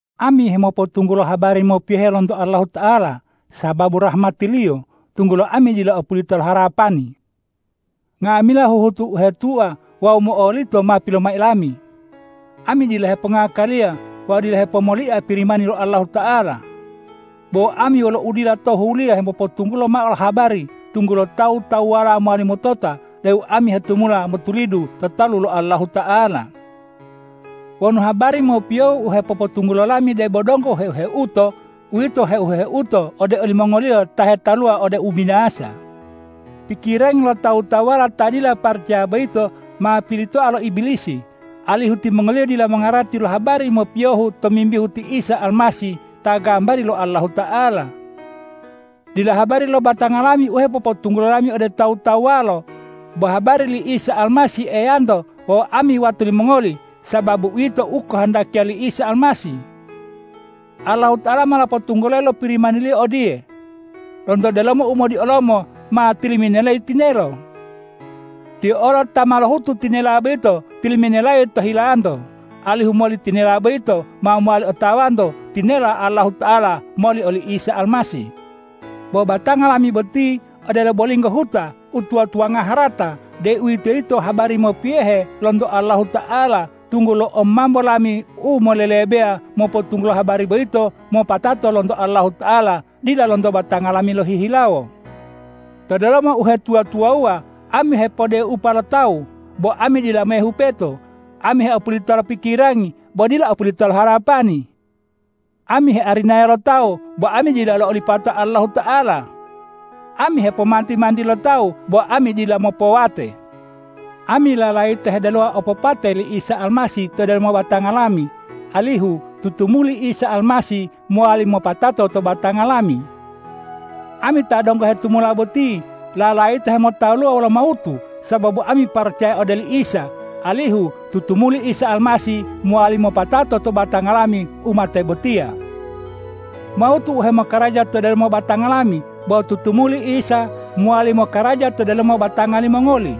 Ami hemopotunggulo habari mopiyohe lonto Allahuta'ala sababu rahmati-Liyo, tunggulo ami dila opulita lo harapani. Nga'amila huhutu u hetua wawu mo'olito ma pilomai lami. Ami dila hepongakaliya wawu dila hepomolia Pirimani lo Allahuta'ala. Bo ami wolo udila tohuliya hepopotunggula mao lo obobanari, tunggulo tawu-tawuwalo mowali motota deu ami hetumula motulidu to talu lo Allahuta'ala. Wonu habari mopiyohu u hepopotunggulo lami debo donggo heu-heuto, uwito heu-heuto ode olimongoliyo ta hetaluwa ode ubinasa. Pikirangi lo tawu-tawuwala ta dila paracaya boyito ma pilitoa lo Ibilisi, alihu timongoliyo dila mongarati lo habari mopiyohu tomimbihu ti Isa Almasih ta gambari lo Allahuta'ala. Dila habari lo batanga lami u hepopotunggulo lami ode tawu-tawuwalo, bo habari li Isa Almasih Eyanto wawu ami wato limongoli, sababu uwito u okohondakiya li Isa Almasih. Allahuta'ala ma lopotunggulayi lo Pirimani-Liyo odiye,”Lonto delomo umodiolomo ma tiliminelayi tinelo!” Tiyo olo ta ma lohutu tinela boyito tiliminelayi to hilanto, alihu moli tinela boyito ma mowali otawanto tinelo Allahuta'ala moli oli Isa Almasih. Bo batanga lami boti odelo bolinggo huta u tuwa-tuwanga harata, deuwitoyito habari mopiyohe lonto Allahuta'ala, tunggulo omambo lami u molelebeya mopotunggulo habari boyito, mopatato lonto Allahuta'ala dila lonto batanga lami lohihilawo. To delomo uhetuwa-tuwawuwa ami hepodupea lo tawu, bo ami dila mehupeto; ami heopulita lo pikirangi, bo dila opulita lo harapani. Ami hearinaya lo tawu, bo ami dila olipata lo Allahuta'ala; ami hepomanti-manti lo tawu, bo ami dila mopowate. Ami lalayita hedelowa opopate li Isa Almasih to delomo batanga lami, alihu tutumuli Isa Almasih mowali mopatato to batanga lami. Ami ta donggo hetumula boti lalayita hemotaluwa wolo mawutu sababu ami paracaya ode oli Isa, alihu tutumuli Isa Almasih mowali mopatato to batanga lami u mate botiya. Mawutu u hemokaraja to delomo batanga lami, bo tutumuli Isa mowali mokaraja to delomo batanga limongoli.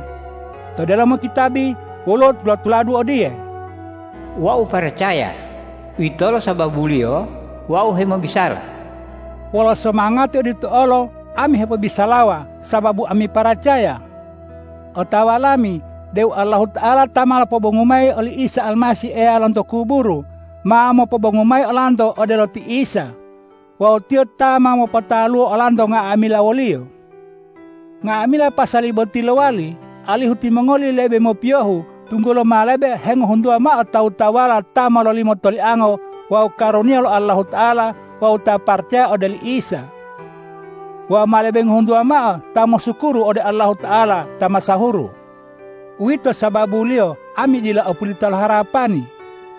To delomo kitabi woluwo tula-tuladu odiye,”Wau paracaya; uwitolo sababuliyo wau hemobisala.” Wolo somangati odito olo, ami hepobisalawa, sababu ami paracaya. Otawa lami deu Allahuta'ala ta ma lopobongu mayi oli Isa Almasih Eya lonto kuburu, ma mopobongu mayi olanto odelo ti Isa. Wawu Tiyo ta ma mopotaluwo olanto nga'amila wo-Liyo. Nga'amila pasali boti lowali, alihu timongoli lebe mopiyohu, tunggulo ma lebe hengohuntuwa mao tawu-tawuwala ta mololimo toliango wawu karuniya lo Allahuta'ala wawu ta paracaya ode oli Isa. Wawu ma lebe hengohuntuwa mao ta mosukuru ode Allahuta'ala ta masahuru. Uwito sababuliyo ami dila opulita lo harapani,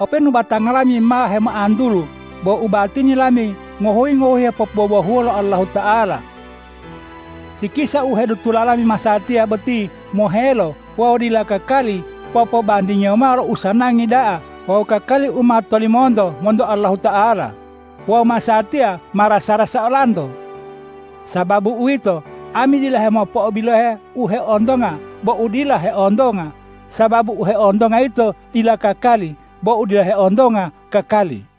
openu batanga lami ma hemoantulu. Bo ubatini lami ngohuyi-ngohuyi hepopobohuwa lo Allahuta'ala. Sikisa u hedutola lami masatiya boti mohelo wawu dila kakali popobandingiyo mao lo usanangi da'a wawu kakali u ma tolimonto monto Allahuta'ala. Wawu masatiya ma rasa-rasa olanto. Sababu uwito, ami dila hemopo'obilohe u heontonga bo u dila heontonga, sababu u heontonga yito dila kakali bo u dila heontonga kakali.